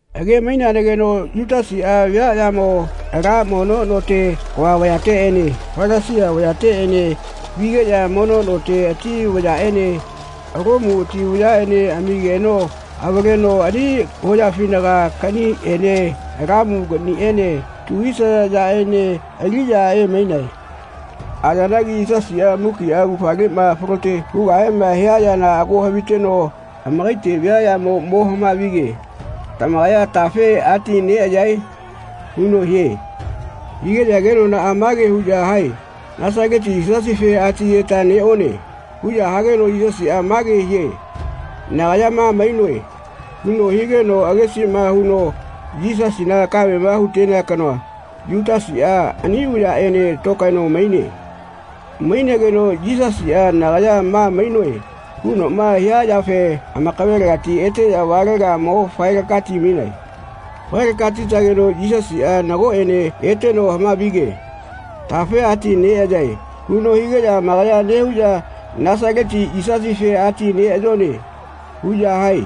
Age-maineanagino Yutasiꞌa viaꞌyamo ala mono note kava vayateꞌene Falasia vayateꞌene vigeꞌya mono note ati vayaꞌene Lomu ati vayaꞌene amigeno amavaleno ani hoyafinaga kaꞌniꞌene lamu kaꞌniꞌene tu hisaya yaꞌene aliꞌya emainae. Ayanagi Yisasiꞌa mukiꞌa augafaleꞌma falote hugahema hia yana ago haviteno amakaite viaꞌyamo mo hama-vige “Tamakaya tafe atineꞌayae?” huno hie. Higeꞌya kenonaꞌa mage huꞌya hae “Nasaleti Yisasife ati-yeta neꞌone.” huꞌya hageno Yisasiꞌa mage hie “Nagaya ma mainoe.” huno higeno agesiꞌma huno Yisasina kamema hu-tea kanoa, Yutasiꞌa, ani vayaꞌene tokaeno maine. Mainegeno Yisasiꞌa “Nagaya ma mainoe.” hunoꞌma hia yafe amakavelegati eteꞌya valega mo fae-laka-ti-mainae. Fae-laka-ti-tageno Yisasiꞌa nagoꞌene eteno hama-vige “Tafe ati neꞌayae.” huno higeꞌya amakaya nehuꞌya “Nasaleti Yisasife ati neꞌayone.” huꞌya hae.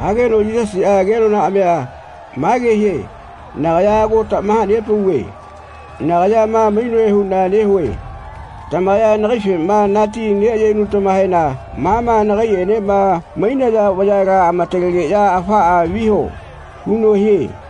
Hageno Yisasiꞌa kenonaꞌamia mage hie “Nagaya ago tamaha-nepauve nagaya ma mainoe huꞌna nehue. Tamakaya nagaifema nati neꞌayenutamahena ma ma nagaiꞌenema mainaya vayala amatalegeꞌya afaꞌa viho.” huno hie.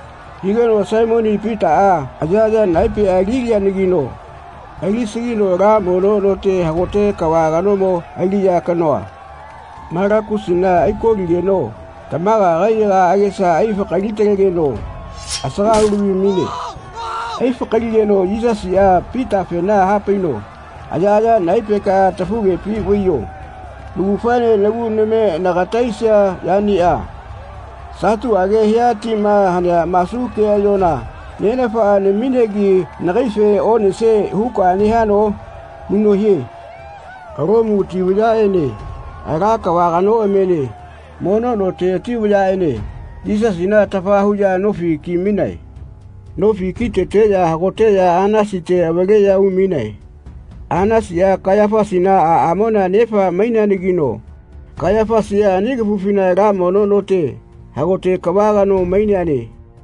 Higeno Saimoni Pitaꞌa ayaꞌaya naepeꞌa ali-lianagino alisagino ala mono note hagote kava kanomo aliꞌya kanoꞌa, Malakusina, ai-koligeno tamaga kaiyaga agesa aifa-kali-talegeno asaga hu-lavi-maine. Ai-fakaligeno Yisasiꞌa Pitafena hapaino “Ayaꞌaya naepekaꞌa tafugepi vaiyo. Naugafaene nagu name nagata aisia yaniꞌa satuꞌage hia tima hanea masu keꞌayola Nenafaꞌa naminegi nagaife onesie huka nehano?” huno hie. Lomu ati vayaꞌene ala kava kanoꞌamiene mono note ati vayaꞌene Yisasina atafa huꞌya nofi ki-mainae. Nofi k-iteteꞌya hagoteꞌya Anasite avaleꞌya umainae. Anasiꞌa Kaiyafasina aꞌamona nefa maineanagino Kaiyafasiꞌa ani kafufina ala mono note hagote kava kano maineane.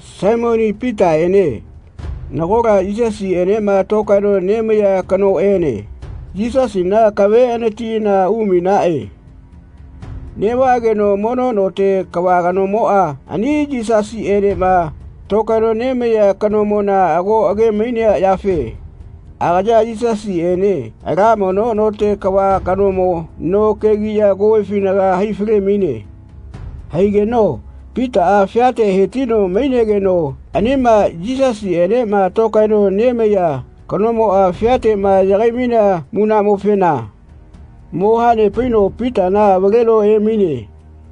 Saimoni Pitaꞌene nagola Yisasiꞌenema tokaeno nemaiya kanoꞌene Yisasina akave anatiꞌana umainaꞌe. Neꞌvaꞌageno mono note kava kanomoꞌa ani Yisasiꞌenema tokaeno nemaiya kanomona ago age-mainea yafe agaya Yisasiꞌene ala mono note kava kanomo no kegiꞌya kovefinaga hai-fale-maine. Haigeno Pitaꞌa fiate he-tino mainegeno anima Yisasiꞌenema tokaeno nemaiya kanomoꞌa fiateꞌma yagai-mainea munaꞌmofena mo hanepaino Pitana avaleno emaine.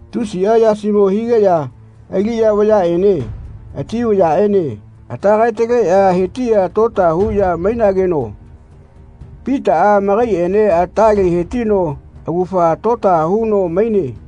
Tusiꞌa yasimo higeꞌya aliꞌya vayaꞌene ati vayaꞌene ata kae-taleꞌya he-tiꞌya tota huꞌya mainageno Pitaꞌa amakaiꞌene atale he-tino augafa tota huno maine.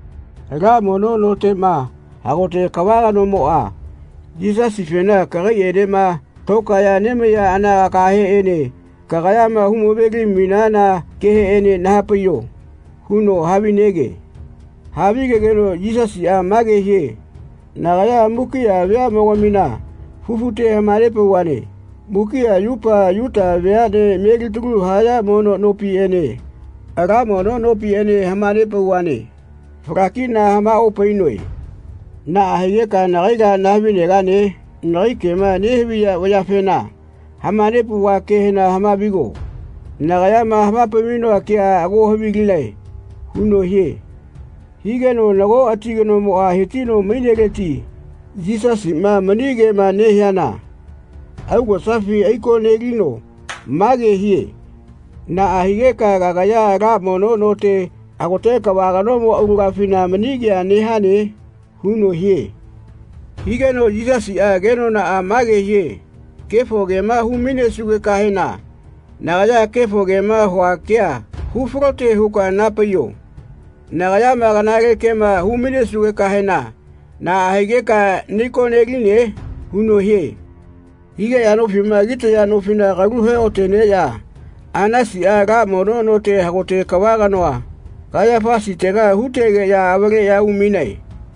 Ala mono noteꞌma hagote kava kanomoꞌa Yisasifena “Kagaiꞌenema tokaeꞌya nemaiya anagakaheꞌene kagayama hu-ma-veli mainana keheꞌene naha-paiyo.” huno havinege. Havigegeno Yisasiꞌa mage hie “Nagaya mukiꞌa veaꞌmogamina fufute hama-nepauvane. Mukiꞌa yupa Yuta veaꞌnea melitaluma haya mono nopiꞌene ala mono nopiꞌene hama-nepauvane. Fala-kiꞌna hama-opainoe. Naꞌa higeka nagaila nahavi-negane? Nagai kema nehaviya vayafena hama-nepauva kehena hama-vigo. Nagayama hama-pai-mainoa kea ago havilinae.” huno hie. Higeno nago ati kanomoꞌa he-tino maineleti Yisasiꞌma mani kema nehiana augosafi ai-ko-nelino mage hie “Naꞌa higeka kagaya ala mono note hagote kava kanomo aulagafina mani kea nehane?” huno hie. Higeno Yisasiꞌa kenonaꞌa mage hie “Kefo kema hu-mainesugekahena nagaya kefo kema hua kea hu-falote huka naha-paiyo. Nagayama kanale kema hu-mainesugekahena naꞌa higeka nai-ko-neline?” huno hie. Higeꞌya nofiꞌma kitaya nofila kalu he-oꞌa-teneꞌya Anasiꞌa ala mono note hagote kava kanoa, Kaiyafasitega hu-tegeꞌya avaleꞌya umainae.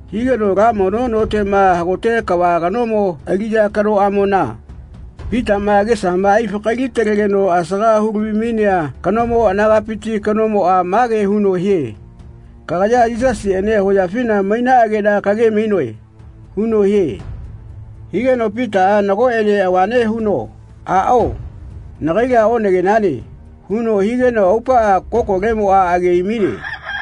Higeno ala mono noteꞌma hagote kava kanomo aliꞌya kanoꞌamona, Pitaꞌma agesama ai-fakali-talegeno asaga hu-lavi-mainea kanomo anagapiti kanomoꞌa mage huno hie “Kagaya Yisasiꞌene hoyafina mainaꞌageꞌna kage-mainoe.” huno hie. Higeno Pitaꞌa nagoꞌene avane huno “Aꞌao nagaila onagenane.” huno higeno aupaꞌa kokolemoꞌa age ai-maine.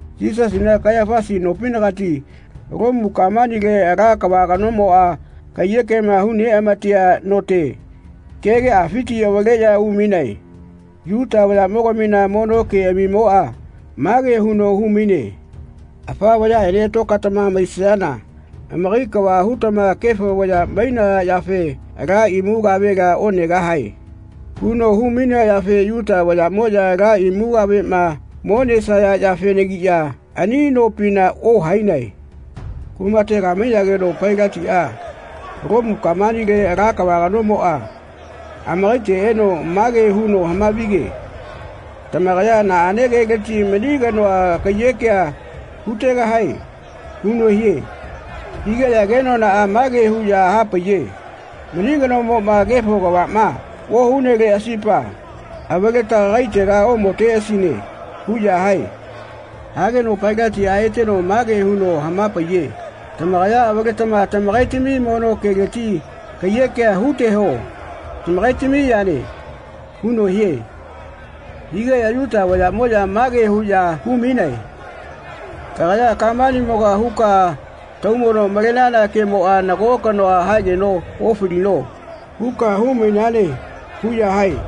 Yisasina Kaiyafasi nopinagati Lomu kamanile ala kava kanomoꞌa kaiyekema hu-neꞌamatea note kegeꞌafiti avaleꞌya umainae. Yuta vayaꞌmogamina mono keꞌamimoꞌa mage huno hu-maine “Afa vayaꞌene tokaetama maisayana amakai kava hutama kefo vaya mainaya yafe ala imu kavela onegahae.” huno hu-mainea yafe Yuta vayaꞌmoꞌya ala imu kaveꞌma mo nesaya yafenagiꞌya ani nopina ohainae. Kumatega mainageno Pailatiꞌa, Lomu kamanile ala kava kanomoꞌa, amakaite eno mage huno hama-vige “Tamakaya naꞌane keleti mani kanoa kaiyekea hu-tegahae?” huno hie. Higeꞌya kenonaꞌa mage huꞌya hapaiye “Mani kanomoꞌma kefo kavaꞌma ohuneleꞌasipa avaleta kagaitela omoteꞌasine.” huꞌya hae. Hageno Pailatiꞌa eteno mage huno hama-paiye “Tamakaya avaletama tamakaitami mono keleti kaiyekea hu-teho tamakaitami yane.” huno hie. Higeꞌya Yuta vayaꞌmoꞌya mage huꞌya hu-mainae “Kagaya kamanimoga huka taumono malenana kemoꞌa nago kanoa haegeno ofalino.” huka hu-mainane huꞌya hae.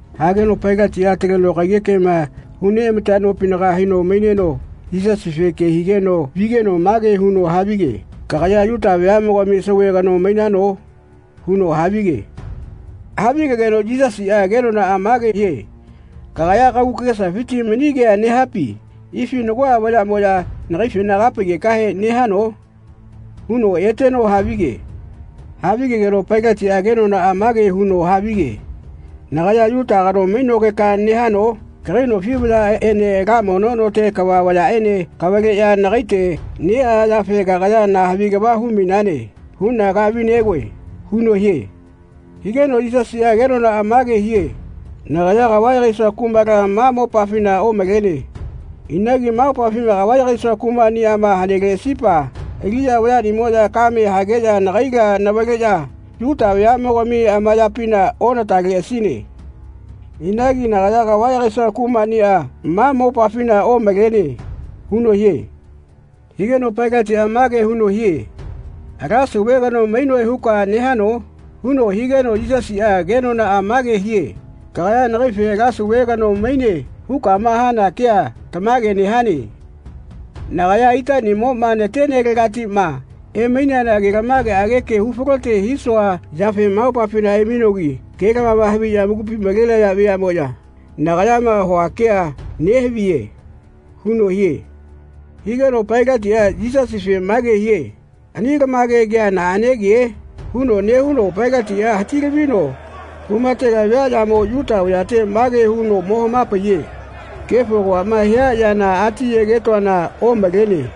Hageno Pailatiꞌa ataleno kaiyekema hu-neꞌama-tea nopinaga haino maineno Yisasife ke higeno vigeno mage huno havige “Kagaya Yuta veaꞌnogami sauve kano mainano?” huno havige. Havigegeno Yisasiꞌa kenonaꞌa mage hie “Kagaya kagu kagesafiti mani kea nehapi ifi nagoꞌa vayaꞌmoꞌya nagaifena kaha-paigekahe nehano?” huno eteno havige. Havigegeno Pailatiꞌa kenonaꞌa mage huno havige “Nagaya Yuta kano mainogeka nehano? Kagai nofi vayaꞌene ala mono note kava vayaꞌene kavaleꞌya nagaite neꞌaya yafena kagaya na havi kava hu-mainane huꞌna kahavi-negoe.” huno hie. Higeno Yisasiꞌa kenonaꞌa mage hie “Nagaya kava yagaisua kumala ma mopafina omalene. Inagi ma mopafima kava yagaisua kumaꞌniꞌama haneleꞌasipa aliꞌya vayaꞌnimoꞌya kamea hageꞌya nagaila navaleꞌya Yuta vayaꞌmogami amayapina onataleꞌasine. Inagi nagaya kava yagaisua kumaꞌniꞌa ma mopafina omalene.” huno hie. Higeno Pailatiꞌa mage huno hie “Ala sauve kano mainoe huka nehano?” huno higeno Yisasiꞌa kenonaꞌa mage hie “Kagaya nagaife ala sauve kano mainane hukama hana kea tamage nehane. Nagaya itaꞌnimoꞌma natenelegatiꞌma emaineana ke-lamaꞌage hu-falote hisua yafe ma mopafina emainogi ke-lamama haviꞌya amakupi malenaya veaꞌmoꞌya nagayama hua kea nehaviye.” huno hie. Higeno Pailatiꞌa Yisasife mage hie “Ani ke-lamage kea naꞌane ke?” huno nehuno Pailatiꞌa hati-lavino kumatega viaꞌyamo Yuta vayate mage huno mo hama-paiye “Kefo kavaꞌma hia yana ati ayegetoana omalene.